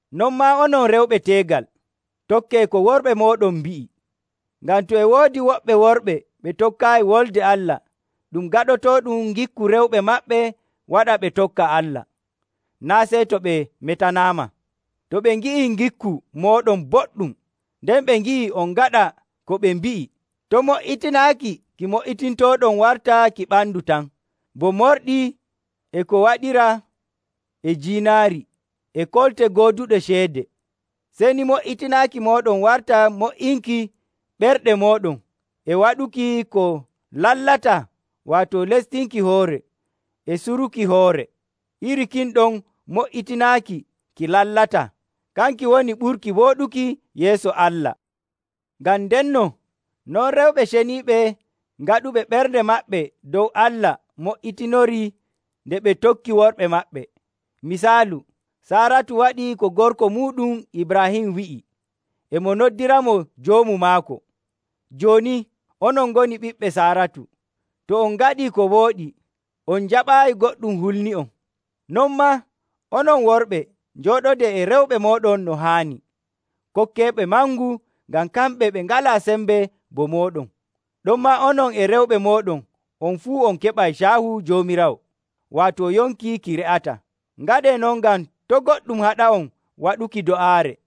Non maa onon rewɓe teegal, tokkee ko worɓe mooɗon mbi'i. Ngam to e woodi woɓɓe worɓe ɓe tokkaayi Wolde Allah, ɗum gaɗotooɗum ngikku rewɓe maɓɓe waɗa ɓe tokka Allah, naa' sey to ɓe metanaama, to ɓe ngi'ii ngikku mooɗon boɗɗum nden ɓe ngi'i on ngaɗa ko ɓe mbi'i. To' mo''itinaaki ki mo''itintooɗon warta ki ɓandu tan, bo morɗi, e ko waɗiraa e jiinaari, e kolte gooduɗe ceede. Sey ni mo''itinaaki mooɗon warta mo''inki ɓerɗe mooɗon e waɗuki ko lallataa waato lestinki hoore, e suruki hoore. Iri kin ɗon mo''itinaaki ki lallataa; kanki woni ɓurki wooɗuki yeeso Allah. Ngam ndenno non rewɓe ceniiɓe gaɗuɓe ɓerɗe maɓɓe dow Allah mo''itinorii nde ɓe tokki worɓe maɓɓe. Misaalu, Saaratu waɗii ko gorko muuɗum Ibraahim wi'i, e mo noddiramo joomu maako. Jooni, onon ngoni ɓiɓɓe Saaratu to on ngaɗii ko wooɗi, on njaɓaayi goɗɗum hulni'on. Non maa, onon worɓe, njooɗodee e rewɓe mooɗon no haani. Kokkeeɓe mangu ngam kamɓe ɓe ngalaa sembe bo mooɗon, ɗonmaa onon e rewɓe mooɗon on fuu on keɓay caahu Joomiraawo, waato yonki ki re'ataa. Ngaɗee non ngam to' goɗɗum haɗa'on waɗuki do'aare.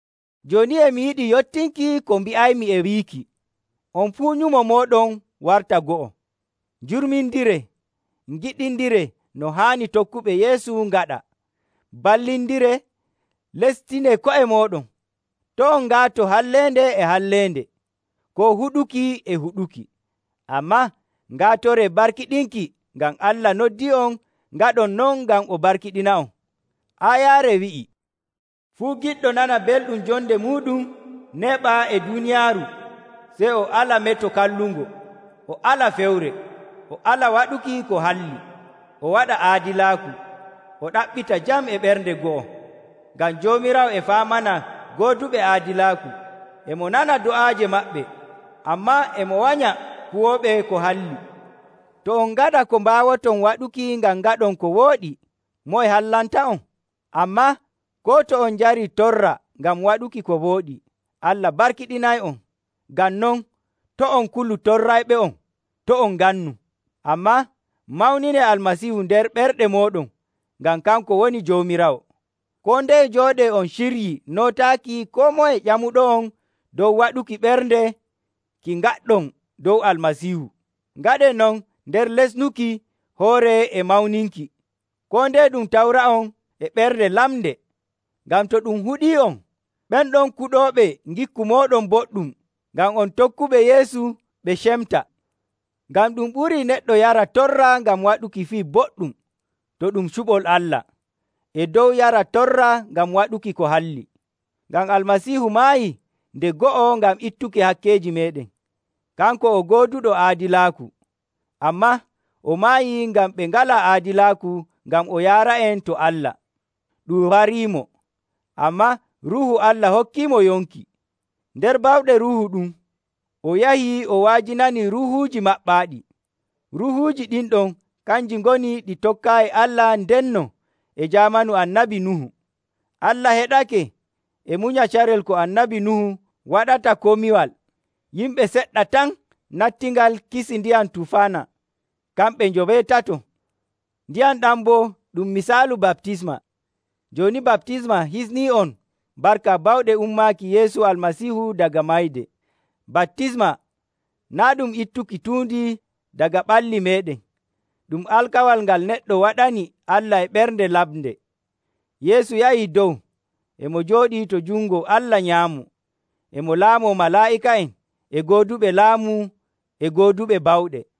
Jooni e mi yiɗi yottinki ko mbi'aymi e wiiki, on fuu nyumo mooɗon warta go'o. Njurmindiree, ngiɗindiree no haani tokkuɓe Yeesu ngaɗa, mballindiree, lestinee ko'e mooɗon. To' on ngaato halleende e halleende, koo huɗuki e huɗuki, ammaa ngaatoree barkiɗinki, ngam Allah noddii'on ngaɗon non ngam o barkiɗina'on. Aayaare wi'ii, “Fuu giɗɗo nana belɗum jonde muuɗum, neeɓa e duuniyaaru, sey o ala meto kallungo, o ala fewre. O ala waɗuki ko halli, o waɗa aadilaaku; o ɗaɓɓita jam e ɓernde go'o. Ngam Joomiraawo e faamana gooduɓe aadilaaku, e mo nana do'aaje maɓɓe, ammaa e mo wanya kuwooɓe ko halli.” To on ngaɗa ko mbaawoton waɗuki ngam ngaɗon ko wooɗi, moye hallanta'on? Ammaa koo to on njarii torra ngam waɗuki ko wooɗi, Allah barkiɗinay'on. Ngam non, to' on kulu torrayɓe'on, to' on ngannu. Ammaa mawninee Almasiihu nder ɓerɗe mooɗon ngam kanko woni Joomiraawo. Koo ndeye njooɗee on ciryii nootaaki koo moye ƴamuɗo'on dow waɗuki ɓernde ki ngaɗɗon dow Almasiihu. Ngaɗee non nder lesnuki hoore e mawninki. Koo ndeye ɗum tawra'on e ɓernde lamnde, ngam to ɗum huɗii'on, ɓen ɗon kuɗooɓe ngikku mooɗon boɗɗum ngam on tokkuɓe Yeesu ɓe cemta. Ngam ɗum ɓurii neɗɗo yara torra ngam waɗuki fii boɗɗum, to ɗum cuɓol Allah, e dow yara torra ngam waɗuki ko halli. Ngam Almasiihu maayii nde go'o ngam ittuki hakkeeji meeɗen. Kanko o gooduɗo aadilaaku, ammaa o maayii ngam ɓe ngalaa aadilaaku ngam o yaara'en to Allah. Ɗum wariimo, ammaa Ruuhu Allah hokkiimo yonki. Nder bawɗe Ruuhu ɗum o yahi o wa'ajinani ruuhuuji maɓɓaaɗi. Ruuhuuji ɗin ɗon kanji ngoni ɗi tokkaayi Allah ndenno e jaamanu Annabi Nuhu. Allah heɗake e munya carel ko Annabi Nuhu waɗata komiwal. Yimɓe seɗɗa tan nattingal kisi ndiyam tufaana, kamɓe njoweetato. Ndiyam ɗam boo ɗum misaalu baptisma. Jooni baptisma hisnii'on barka bawɗe ummaaki Yeesu Almasiihu daga mayde. Baptisma naa' ɗum ittuki tuundi daga ɓalli meeɗen, ɗum alkawal ngal neɗɗo waɗani Allah e ɓernde lamnde. Yeesu yahi dow, e mo jooɗii to jungo Allah nyaamo, e mo laamoo malaa'ika'en, e gooduɓe laamu, e gooduɓe bawɗe.